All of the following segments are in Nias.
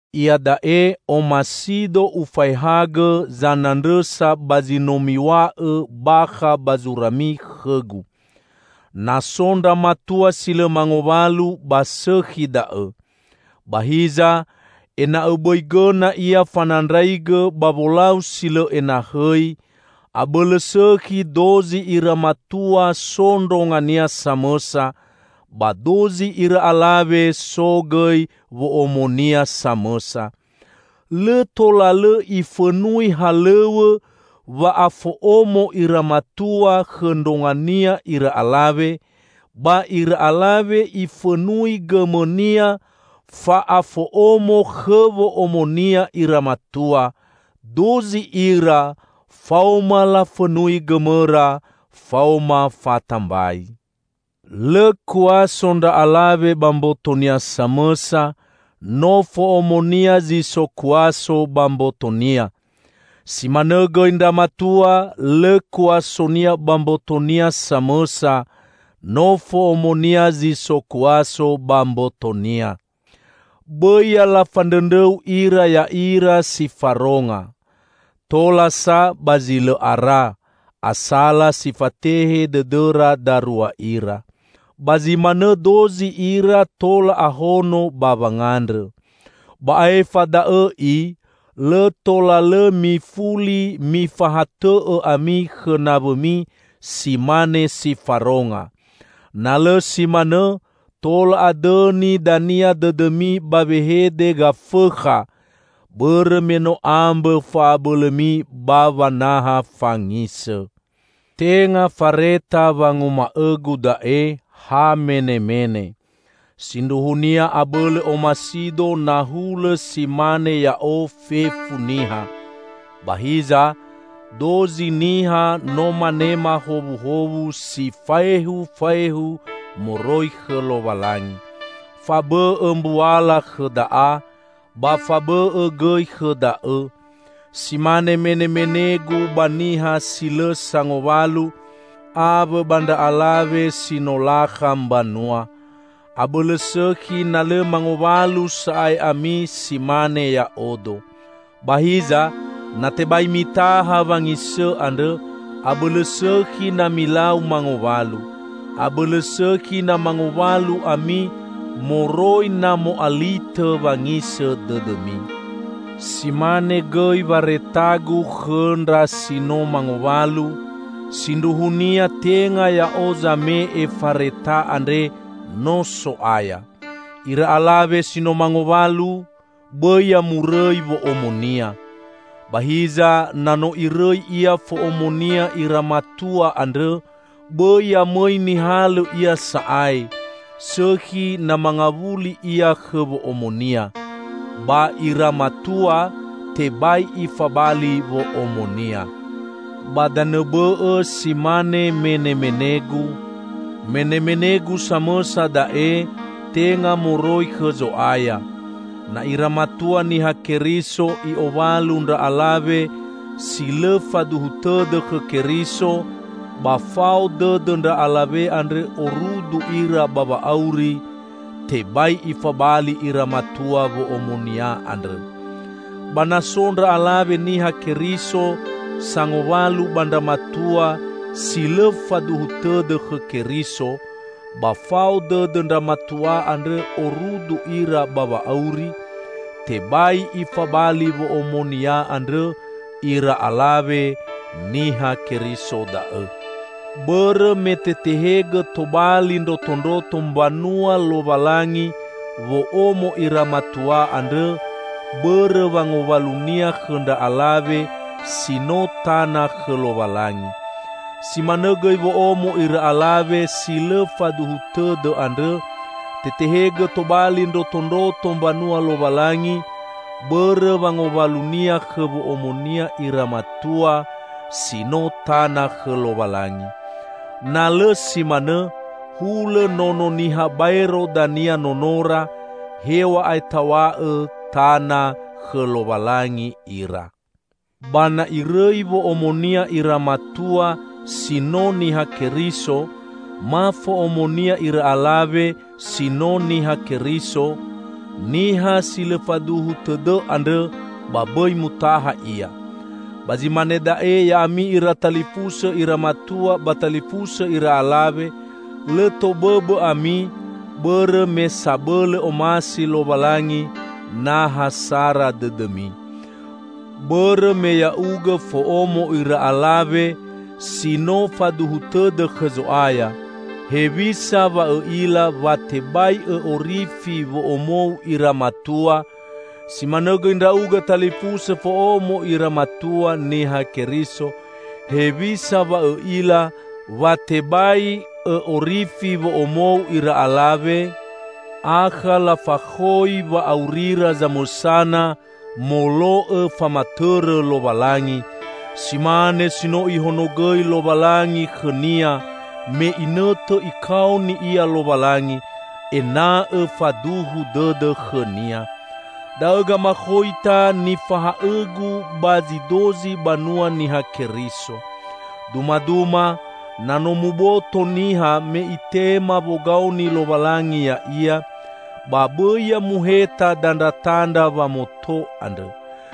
Iada'e omasido ufaehagõ zanandrõsa ba zi no miw̃a'õ bakha ba zurami khõgu. Na so ndra matua si lõ mangowalu, ba sõkhi da'õ. Ba hiza, ena'õ bõi gõna ia fanandraigõ ba wolau si lõ enahõi, abõlõ sõkhi dozi ira matua so ndrongania samõsa, ba dozi ira alawe so gõi wo'omonia samõsa. Lõ tola lõ ifõnui halõw̃õ wa'afo'omo ira matua khõ ndrongania ira alawe, ba ira alawe ifõnui gõmõnia fa'afo'omo khõ wo'omonia ira matua; dozi ira faoma lafõnui gõmõra faoma fatambai. Lõ kuaso ndra alawe ba mbotonia samõsa; no fo'omonia zi so kuaso ba mbotonia. Si manõ gõi ndra matua, lõ kuasonia ba mbotonia samõsa; no fo'omonia zi so kuaso ba mbotonia. Bõi ya lafandrõndrõu ira ya'ira si faronga. Tola sa ba zi lõ ara, asala si fatehe dõdõra darua ira. Ba zi manõ dozi ira tola ahono ba wangandrõ. Ba aefa da'õ i, lõ tola lõ mifuli mifahatõ'õ ami khõ naw̃õmi si mane si faronga. Na lõ si manõ, tola adõni dania dõdõmi ba wehede gafõkha, bõrõ me no ambõ fa'abõlõmi ba wanaha fangisõ. Tenga fareta wanguma'õgu da'e, ha menemene. Sindruhunia abõlõ omasido na hulõ si mane ya'o fefu niha. Ba hiza, dozi niha no manema howuhowu si faehufaehu moroi khõ Lowalangi. Fabõ'õ mbuala khõ da'a, ba fabõ'õ gõi khõ da'õ. Si mane menemenegu ba niha si lõ sangowalu awõ ba ndra alawe si no lakha mbanua: Abõlõ sõkhi na lõ mangowalu sa'ae ami si mane ya'odo. Ba hiza, na tebai mitaha wangisõ andrõ, abõlõ sõkhi na milau mangowalu. Abõlõ sõkhi na mangowalu ami, moroi na mo'alitõ wangisõ dõdõmi. Si mane gõi waretagu khõ ndra si no mangowalu: (Sindruhunia tenga ya'o zame'e fareta andre no So'aya.) Ira alawe si no mangowalu, bõi ya murõi wo'omonia. Ba hiza na no irõi ia fo'omonia ira matua andrõ, bõi ya mõi nihalõ ia sa'ae, sõkhi na mangawuli ia khõ wo'omonia. Ba ira matua, tebai ifabali wo'omonia. Ba danõ bõ'õ si mane menemenegu: -- menemenegu samõsa da'e, tenga moroi khõ Zo'aya -- na ira matua Niha Keriso i'owalu ndra alawe si lõ faduhu tõdõ khõ Keriso, ba fao dõdõ ndra alawe andrõ orudu ira ba wa'auri, tebai ifabali ira matua wo'omonia andrõ. Ba na so ndra alawe Niha Keriso sangowalu ba ndra matua si lõ faduhu tõdõ khõ Keriso, ba fao dõdõ ndra matua andrõ orudu ira ba wa'auri, tebai ifabali wo'omonia andrõ ira alawe Niha Keriso da'õ. Bõrõ me tetehegõ tobali ndrotondroto mbanua Lowalangi wo'omo ira matua andrõ bõrõ wangowalunia khõ ndra alawe si no tana khõ Lowalangi. Si manõ gõi wo'omo ira alawe si lõ faduhu tõdõ andrõ, tetehegõ tobali ndrotondroto mbanua Lowalangi bõrõ wangowalunia khõ wo'omonia ira matua si no tana khõ Lowalangi. Na lõ si manõ, hulõ nono niha baero dania nonora, hew̃a'ae taw̃a'õ tana khõ Lowalangi ira. Ba na irõi wo'omonia ira matua si no Niha Keriso ma fo'omonia ira alawe si no Niha Keriso niha si lõ faduhu tõdõ andrõ, ba bõi mutaha ia. Ba zi mane da'e ya'ami ira talifusõ ira matua ba talifusõ ira alawe, lõ tobõbõ ami, bõrõ me sabõlõ omasi Lowalangi na ha sara dõdõmi. Bõrõ me ya'ugõ fo'omo ira alawe -- si no faduhu tõdõ khõ Zo'aya -- hewisa wa õ'ila wa tebai õ'orifi wo'omou ira matua? Si manõ gõi ndra'ugõ talifusõ fo'omo ira matua Niha Keriso, hewisa wa õ'ila wa tebai õ'orifi wo'omou ira alawe? Akha lafakhoi wa'aurira zamõsana molo'õ famatõrõ Lowalangi, si mane si no Ihonogõi Lowalangi khõnia me inõtõ Ikaoni ia Lowalangi ena'õ faduhu dõdõ khõ-Nia. Da'õ gamakhoita nifahaõgu ba zi dozi banua Niha Keriso. Dumaduma, na no muboto niha me itema wogaoni Lowalangi ya'ia, ba bõi ya muheta dandratandra wamoto andrõ.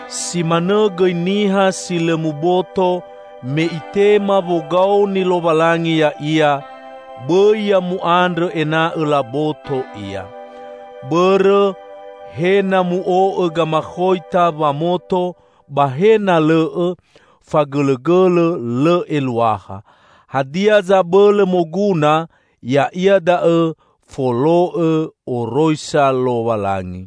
Si manõ gõi niha si lõ muboto me itema wogaoni Lowalangi ya'ia, bõi ya mu'andrõ ena'õ laboto ia. Bõrõ he na mu'o'õ gamakhoita wamoto ba he na lõ'õ, fagõlõgõlõ lõ eluaha. Hadia zabõlõ moguna ya'ia da'õ folo'õ oroisa Lowalangi.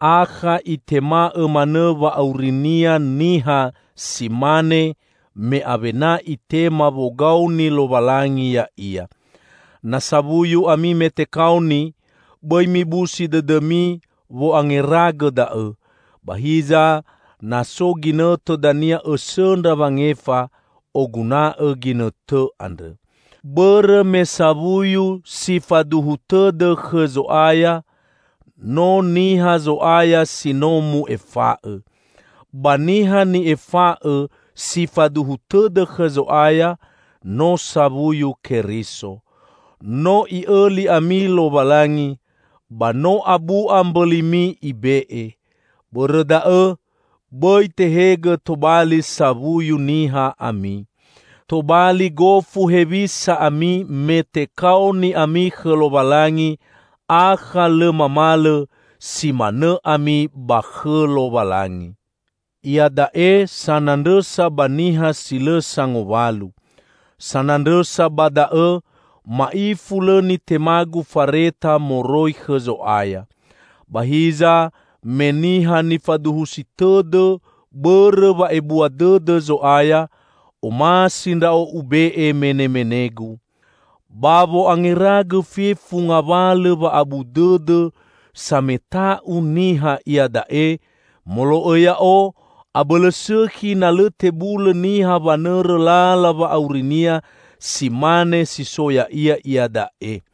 Akha itema'õ manõ wa'aurinia niha si mane me awena itema wogaoni Lowalangi ya'ia. Na sawuyu ami me tekaoni, bõi mibusi dõdõmi wo'angeragõ da'õ. Ba hiza, na so ginõtõ dania õsõndra wangefa, oguna'õ ginõtõ andrõ. Bõrõ me sawuyu si faduhu tõdõ khõ Zo'aya, no niha Zo'aya si no mu'efa'õ. Ba niha ni'efa'õ si faduhu tõdõ khõ Zo'aya, no sawuyu Keriso. No I'õli ami Lowalangi, ba no abu'a mbõlimi Ibe'e. Bõrõ da'õ, bõi tehegõ tobali sawuyu niha ami. Tobali gofu hewisa ami me tekaoni ami khõ Lowalangi, akha lõ mamalõ: si manõ ami ba khõ Lowalangi. Iada'e sanandrõsa ba niha si lõ sangowalu. Sanandrõsa ba da'õ, ma'ifu lõ nitemagu fareta moroi khõ Zo'aya. Ba hiza, me niha nifaduhusi tõdõ bõrõ wa'ebua dõdõ Zo'aya, omasi ndra'o ube'e menemenegu. Ba wo'angeragõ fefu ngawalõ wa'abu dõdõ sameta'u niha iada'e, molo'õ ya'o, abõlõ sõkhi na lõ tebulõ niha wanõrõ lala wa'aurinia si mane si so ya'ia iada'e.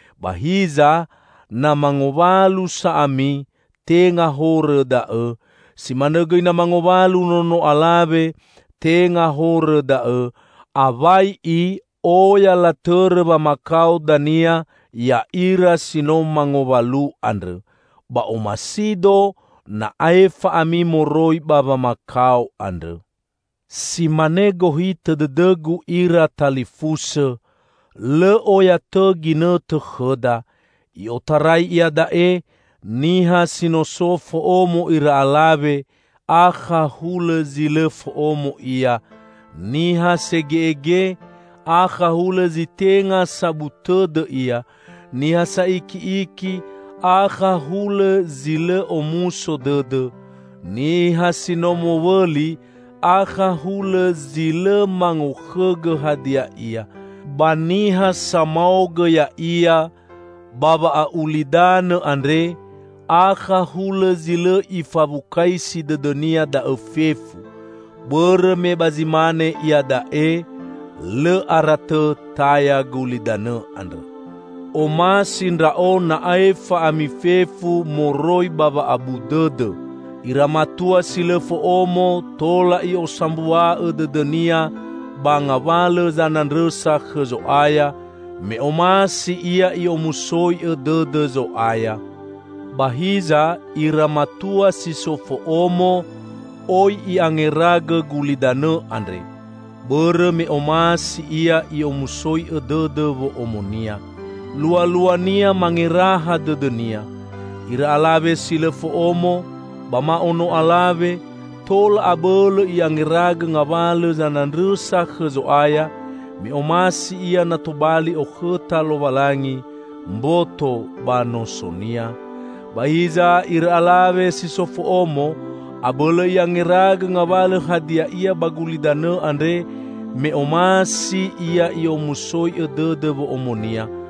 Ba hiza na mangowalu sa ami, tenga horõ da'õ. Si manõ gõi na mangowalu nono alawe, tenga horõ da'õ. Awai i, oya latõrõ wamakao dania ya'ira si no mangowalu andrõ. Ba omasido na aefa ami moroi ba wamakao andrõ. Si mane gohitõ dõdõgu ira talifusõ: Lõ oya tõ ginõtõ khõda. I'otarai iada'e, niha si no so fo'omo ira alawe, akha hulõ zi lõ fo'omo ia; niha sege'ege, akha hulõ zi tenga sabu tõdõ ia; niha sa'iki'iki, akha hulõ zi lõ omuso dõdõ, niha si no mowõli, akha hulõ zi lõ mangokhõgõ hadia ia; ba niha samaogõ ya'ia ba wa'a'ulidanõ andre, akha hulõ zi lõ ifawukaisi dõdõnia da'õ fefu. Bõrõ me ba zi mane iada'e, lõ ara tõ taya gulidanõ andrõ! Omasi ndra'o na aefa ami fefu moroi ba wa'abu dõdõ. Ira matua si lõ fo'omo tola i'osambua'õ dõdõnia ba ngawalõ zanandrõsa khõ Zo'aya, me omasi ia i'omusoi'õ dõdõ Zo'aya. Ba hiza, ira matua si so fo'omo oi i'angeragõ gulidanõ andre, bõrõ me omasi ia i'omusoi'õ dõdõ wo'omonia; lualuania mangeraha dõdõnia. Ira alawe si lõ fo'omo ba ma ono alawe, tola abõlõ i'angeragõ ngawalõ zanandrõsa khõ Zo'aya, me omasi ia na tobali okhõta Lowalangi mboto ba nosonia. Ba hiza, ira alawe si so fo'omo, abõlõ i'angeragõ ngawalõ hadia ia ba gulidanõ andre, me omasi ia i'omusoi'õ dõdõ wo'omonia.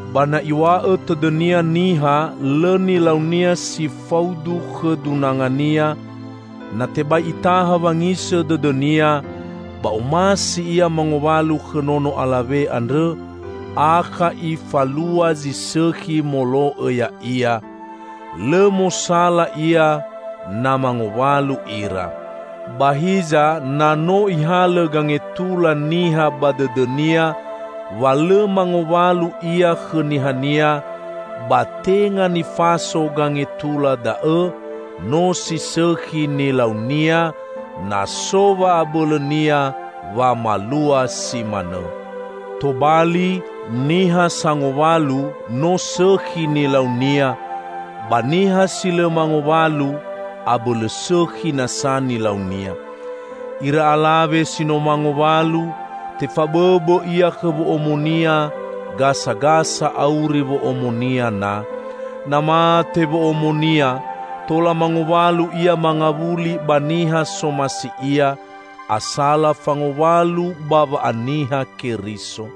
Ba na iw̃a'õ tõdõnia niha lõ nilaunia si faudu khõ dunangania, na tebai itaha wangisõ dõdõnia, ba omasi ia mangowalu khõ nono alawe andrõ, akha ifalua zi sõkhi molo'õ ya'ia. Lõ mosala ia na mangowalu ira. Ba hiza na no ihalõ gangetula niha ba dõdõnia wa lõ mangowalu ia khõ nihania, ba tenga nifaso gangetula da'õ, no si sõkhi nilaunia, na so wa'abõlõnia wamalua si manõ. Tobali, niha sangowalu no sõkhi nilaunia, ba niha si lõ mangowalu abõlõ sõkhi nasa nilaunia. Ira alawe si no mangowalu, tefabõbõ ia khõ wo'omonia gasagasa auri wo'omonia na. Na mate wo'omonia, tola mangowalu ia mangawuli ba niha somasi ia, asala fangowalu ba wa'aniha Keriso.